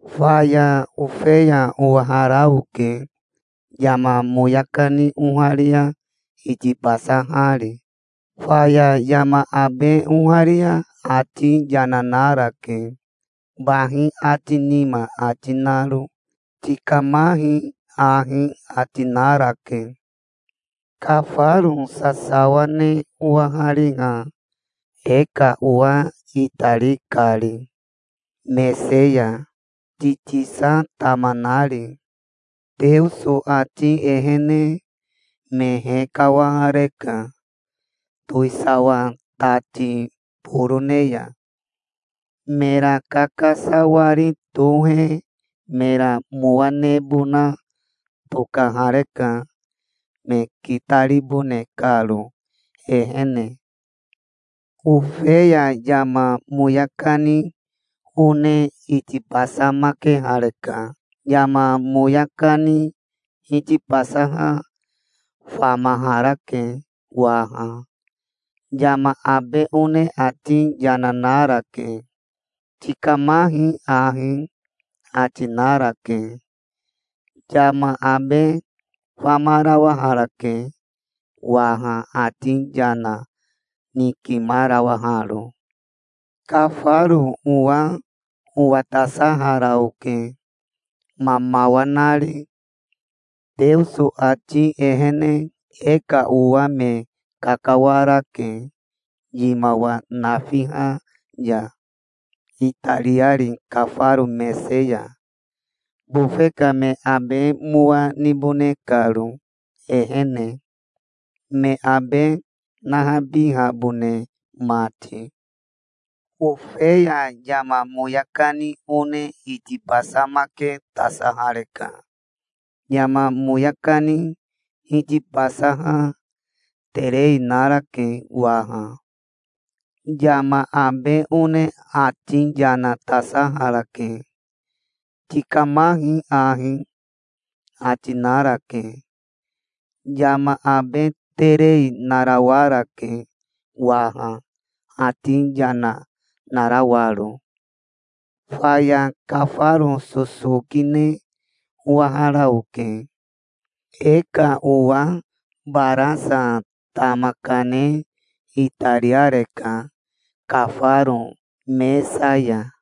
Faya Ofeya owahara oke, yama moya kani oharia itibasahari. Faya yama abe oharia ati yana narake, bahi ati nima ati naro. "Tikamahi ahi", ati narake. Kafaro sasawa ne owahari ha, e ka owa itari kari mese ya, titisa tama nari. Teoso ati ehene me hekawareka towisawa tati borone ya. Mera kakasawari tohe mera mowa nebona tokahareka, me kitaribone karo ehene. Ofeya yama moya kani one itibasamakehareka. Yama moya kani hitibasaha famaharake waha. Yama abe one ati yana narake. "Tikamahi ahi", ati narake. Yama abe famarawaharake waha ati yana nikimarawaharo. Kafaro owa owatasahara oke, mamawa nari. Teoso ati ehene e ka owa me kakawarake yimawa nafiha ya, itariari kafaro mese ya, bofe ka me abe mowa nibone karo ehene, me abe nahabihabone mati. Ofeya yama moya kani one itibasamaketasahareka. Yama moya kani hitibasaha terei narake waha. Yama abe one ati yana tasaharake. "Tikamahi ahi", ati narake. Yama abe terei narawarake waha ati yana narawaro. Faya kafaro sosoki ne owahara oke. E ka owa barasa tama kane itariareka kafaro mesa ya.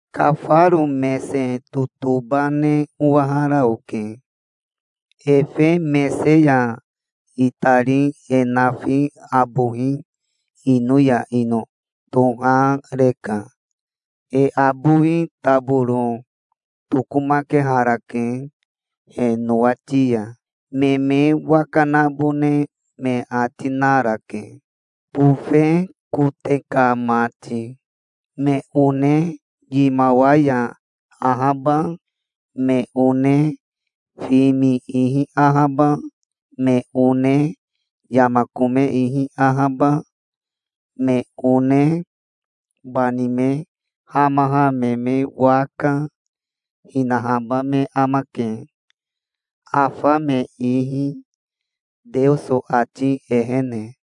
Kafaro mese totoba ne owahara oke. Efe mese ya itari e nafi abohi ino ya ino tohareka. E abowi taboro tokomakeharake he nowati ya. Me me waka nabone me ati narake, bofe kote ka mati. Me one yimawa ya ahaba, me one fimi ihi ahaba, me one yama kome ihi ahaba, me one bani me hamaha me me waka, hinahaba me amake, afa me ihi, Teoso ati ehene.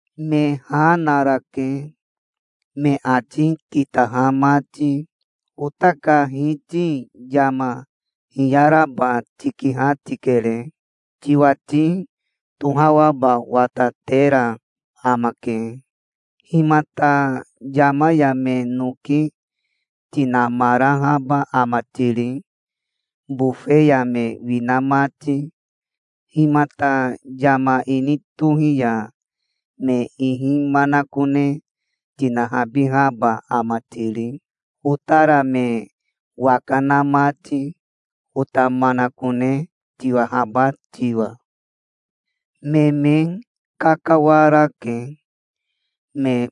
Me ha narake, me ati kitaha mati. "Ota ka Hiti yama hiyaraba tikiha tikere. Tiwati tohawaba watatera amake. Himata yama ya me noki tinamarahaba ama tiri, bofe ya me wina mati? Himata yama ini tohi ya me ihi manakone tinahabihaba ama tiri, otara me waka na mati, ota manakone tiwahaba tiwa?" Me me kakawarake, me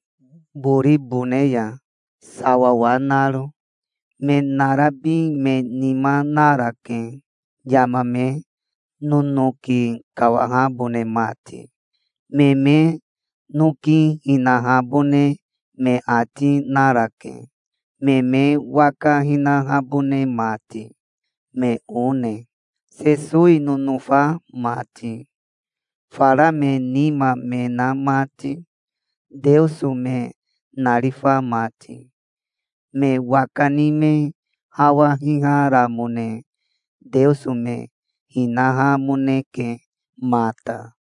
boribone ya, sawawa naro. Me narabi me nima narake, yama me nonoki kawahabone mati. Me me noki hinahabone me ati narake, me me waka hinahabone mati, me one, Sesowi nonofa mati, fara me nima me na mati, Teoso me narifa mati. Me waka ni me hawa hiharamone Teoso me hinahamoneke mata.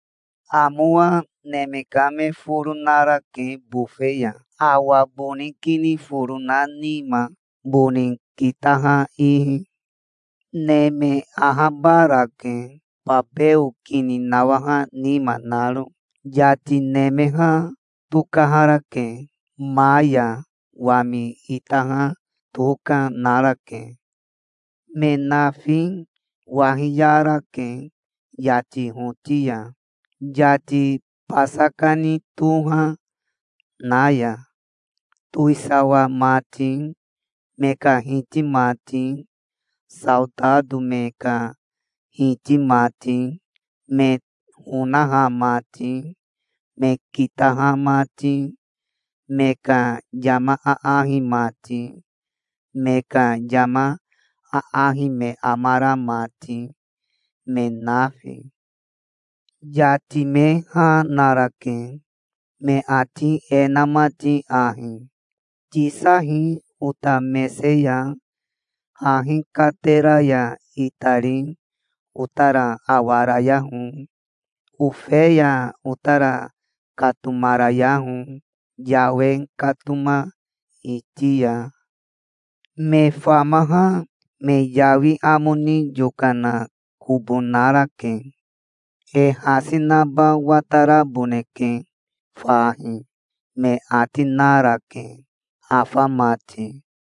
Amowa neme ka me foro narake bofe ya, awa boni kini foro na nima, boni kitaha ihi. Neme ahabarake, babeo kini nawaha nima naro. Yati nemeha tokaharake. Ma ya wami itaha toka narake. Me nafi wahiyarake yati hoti ya, yati basa kani toha na ya. Towisawa mati, me ka hiti mati, saotato me ka hiti mati, me honaha mati, me kitaha mati, me ka yama aahi mati, me ka yama aahi me amara mati, me nafi. Yati me ha narake, me ati e na mati ahi: "Tisahi ota mese ya, hahi katera ya itari otara awarayaho. Ofeya otara katomarayaho, yawe katoma iti ya. Me famaha me yawi amo ni yokana kobo narake. E hasi naba wataraboneke fahi", me ati narake, afa mati.